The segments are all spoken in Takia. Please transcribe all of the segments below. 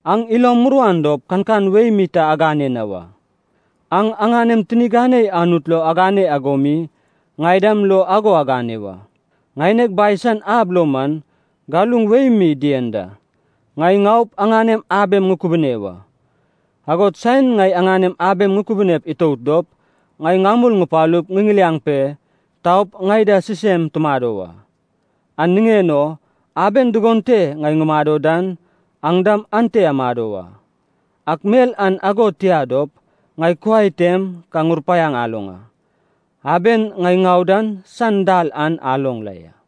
“Aŋ ilom muruan dop kankan wei mi ta agane na wa. Aŋ aŋanem tini ganei Anut lo agane ago mi ŋai dam lo ago agane wa. Ŋaineg Bai san ab lo man, galuŋ wei mi dien da. Ŋai ŋaup aŋanem abem ŋukubune wa. Agod saen ŋai aŋanem abem ŋukubune itout dop, ŋai ŋamul ŋupalup ŋiŋiliaŋ pe taup ŋai da sisem tumado wa. An niŋen o aben dugon te ŋai ŋumado dan, aŋ dam ante amado wa. Ak mel an ago tia dop, ŋai kuai tem ka ŋurupaiaŋ aloŋ a. Aben ŋai ŋau dan san dal an aloŋ la ya.”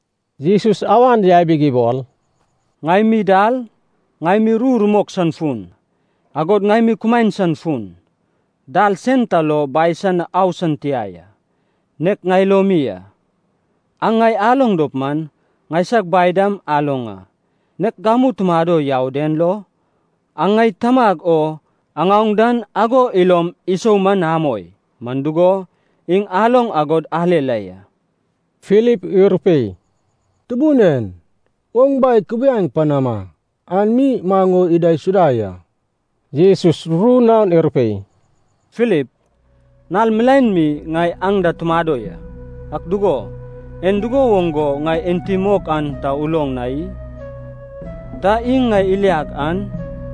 Jesus awan yabig ibol, “Ŋai mi dal, ŋai mi ru rumok san fun, agod ŋai mi kumaen san fun. Dal sen ta lo Bai san na au san tia ya. Nek ŋai lo mi a. Aŋ ŋai aloŋ dop man, ŋaisag Bai dam aloŋ a. Nek gamu tumado yau den lo, aŋ ŋai Tamag o aŋaoŋ dan ago ilom isou man amoi, man dugo, iŋ aloŋ agod ale la ya.” Filip irupei, “Tubun en, oŋ Bai kubiai panama. An mi maŋ o idaisuda ya.” Jesus ru naon irupei, “Filip, nal milaen mi ŋai aŋ da tumado ya. Ak dugo, en dugo woŋ go ŋai enti mok an ta uloŋ na i? Ta iŋ ŋai iliag an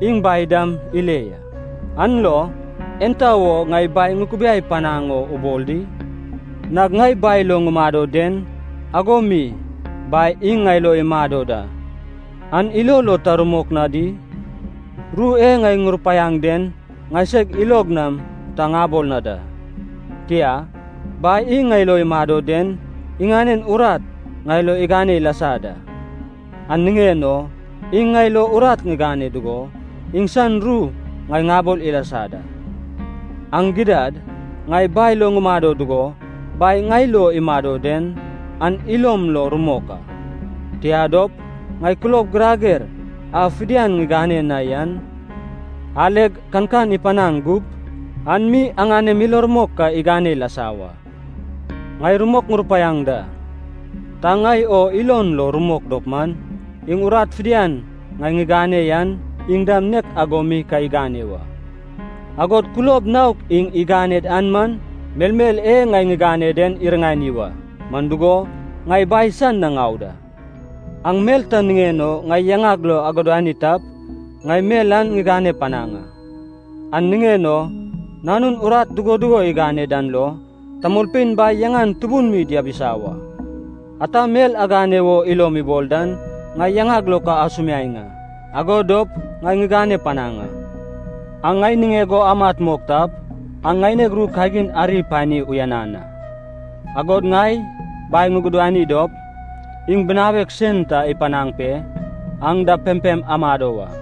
iŋ Bai dam ile ya. An lo, enta wo ŋai Bai ŋukubiai panaŋ o ubol di? Nag ŋai Bai lo ŋumado den, ago mi Bai iŋ ŋai lo imado da, an ilo lo ta rumok na di? Ru e ŋai ŋurupaiaŋ den ŋaiseg ilog nam ta ŋabol na da. Tia, Bai iŋ ŋai lo imado den iŋanen urat ŋai lo igane ilasa da. An niŋen o iŋ ŋai lo urat igane dugo, iŋsan ru ŋai ŋabol ilasa da. Aŋ gidad, ŋai Bai lo ŋumado dugo, Bai ŋai lo imado den, an ilom lo rumok a. Tia dop, ŋai kulob girager a fidian ŋigane na yan aleg kankan ipanaŋ gup, an mi aŋanem ilo rumok ka igane ilasa wa. Ŋai rumok ŋurupaiaŋ da, ta ŋai o ilon lo rumok dop man, iŋ urat fidian ŋai ŋigane yan iŋ dam nek ago mi ka igane wa. Agod kulob naok iŋ iganed an man melmel e ŋai ŋigane den iriŋani wa. Man dugo, ŋai Bai san na ŋau da. Aŋ mel ta niŋen o ŋai yaŋag lo agudani tap, ŋai mel an ŋigane panaŋ a. An niŋen o Nanun urat dugo dugo igane dan lo, tamolpein Bai yaŋan tubun mi diabisa wa. Ata mel aŋane wo ilom ibol dan, ŋai yaŋag lo ka asumiaeŋ a, ago dop ŋai ŋigane panaŋ a.” “Aŋ ŋai niŋeg o amat mok tap, aŋ ŋaineg ru kagin ari apani uyanan a. Agod ŋai Bai ŋugudani dop, iŋ Binawek sen ta ipanaŋ pe, aŋ da pempem amado wa.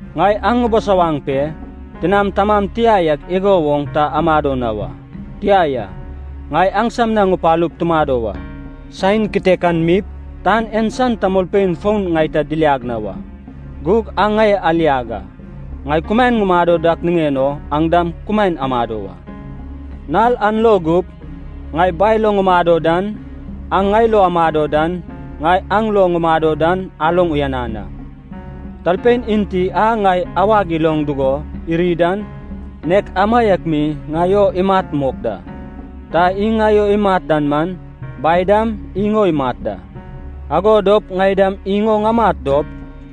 Ŋai aŋ ŋubisawaŋ pe, tinam tamam tia yak igo woŋ ta amado na wa. Tia ya, ŋai aŋsam na ŋupalup tumado wa. Saen kitekan mip, tan en san tamolpein fon ŋai ta diliag na wa. Gug aŋ ŋai aliag a. Ŋai kumaen ŋumado dak niŋen o, aŋ dam kumaen amado wa. Nal an lo gup, ŋai Bai lo ŋumado dan, aŋ ŋai lo amado dan, ŋai aŋ lo ŋumado dan aloŋ uyanan a. Talpein enti a ŋai awag iloŋ dugo iri dan, nek amaiak mi ŋai o imat mok da. Ta iŋ ŋai o imat dan man, Bai dam iŋ o imat da. Ago dop ŋai dam iŋ o ŋamat dop,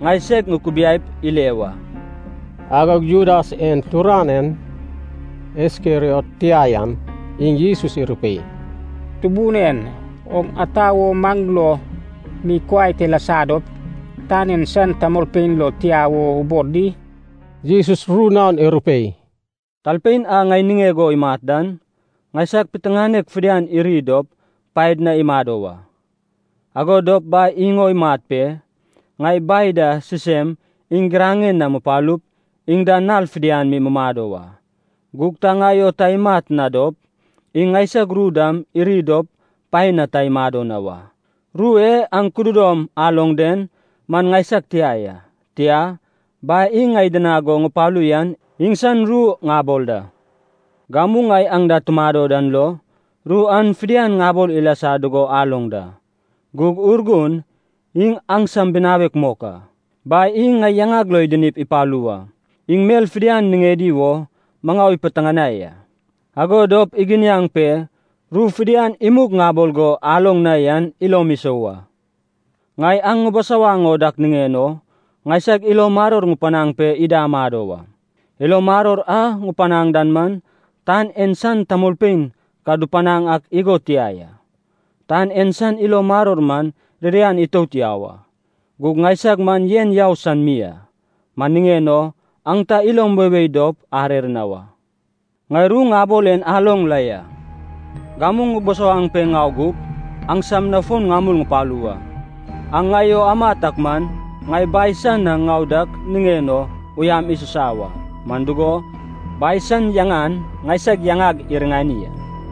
ŋai seg ŋukubiaip ile wa.” Agog Judas en turanein, Iskeriot tia yan, iŋ Jesus irupei, “Tubun en, oŋ ata wo maŋ lo mi kuai te lasa dop, tan en san tamolpein lo tia wo ubol di?” Jesus ru naon irupei, “Talpein a ŋai niŋeg o imat dan, ŋaisag piteŋanek fidian iri dop paed na imado wa. Ago dop Bai iŋ o imat pe, ŋai Bai da sisem iŋ giraŋen na mupalup, iŋ da nal fidian mi mumado wa. Gug ta ŋai o ta imat na dop, iŋ ŋaisag ru dam iri dop paen na ta imado na wa. Ru e aŋ kududom aloŋ den man ŋaisag tia ya. Tia, Bai iŋ ŋai idinag go ŋupalu yan iŋsan ru ŋabol da. “Gamu ŋai aŋ da tumado dan lo, ru an fidian ŋabol ilasa dugo aloŋ da. Gug Urgun, iŋ aŋsam binawek mok a, Bai iŋ ŋai yaŋag lo idinip ipalu wa. Iŋ mel fidian niŋedi wo maŋau ipiteŋanaŋ a, ago dop iginiaŋ pe ru fidian imug ŋabol go aloŋ na yan ilom isou a. Ŋai aŋ ŋubusawaŋ o dak niŋen o, ŋaisag ilo maror ŋupanaŋ pe ida amado wa. Ilo maror a ŋupanaŋ dan man, tan en san tamolpein ka dupanaŋ ak igo tia ya, tan en san ilo maror man ririan itout yau a, gug ŋaisag man yen yau san mi a. Man niŋen o, aŋ ta ilom weiwei dop arer na wa. “Ŋai ru ŋabol en aloŋ la ya: ‘gamu ŋubusawaŋ pe ŋau gup, aŋsam na fon ŋamul ŋupalu wa.’ Aŋ ŋai o amat ak man, ŋai Bai san na ŋau dak niŋen o uyam isusa wa. Man dugo, Bai san yaŋan ŋaisag yaŋag iriŋani a.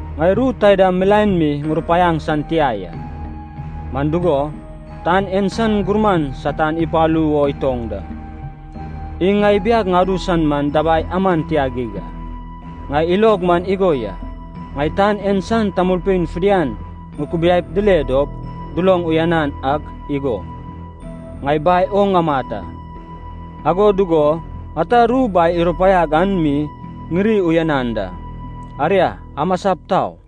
Ŋai ru taida milaen mi ŋurupaiaŋ san tia ya, man dugo, tan en san gurman Satan ipalu wo itoŋ da. Iŋ ŋai ibiag ŋadu san man dabai aman tia geig a. Ŋai ilog man igo ya. Ŋai tan en san tamolpein fidian ŋukubiaip dile dop duloŋ uyanan ak igo, ŋai Bai o ŋamat a, ago dugo ata ru Bai irupaiag an mi ŋiri uyanan da. Aria, amasap tau.”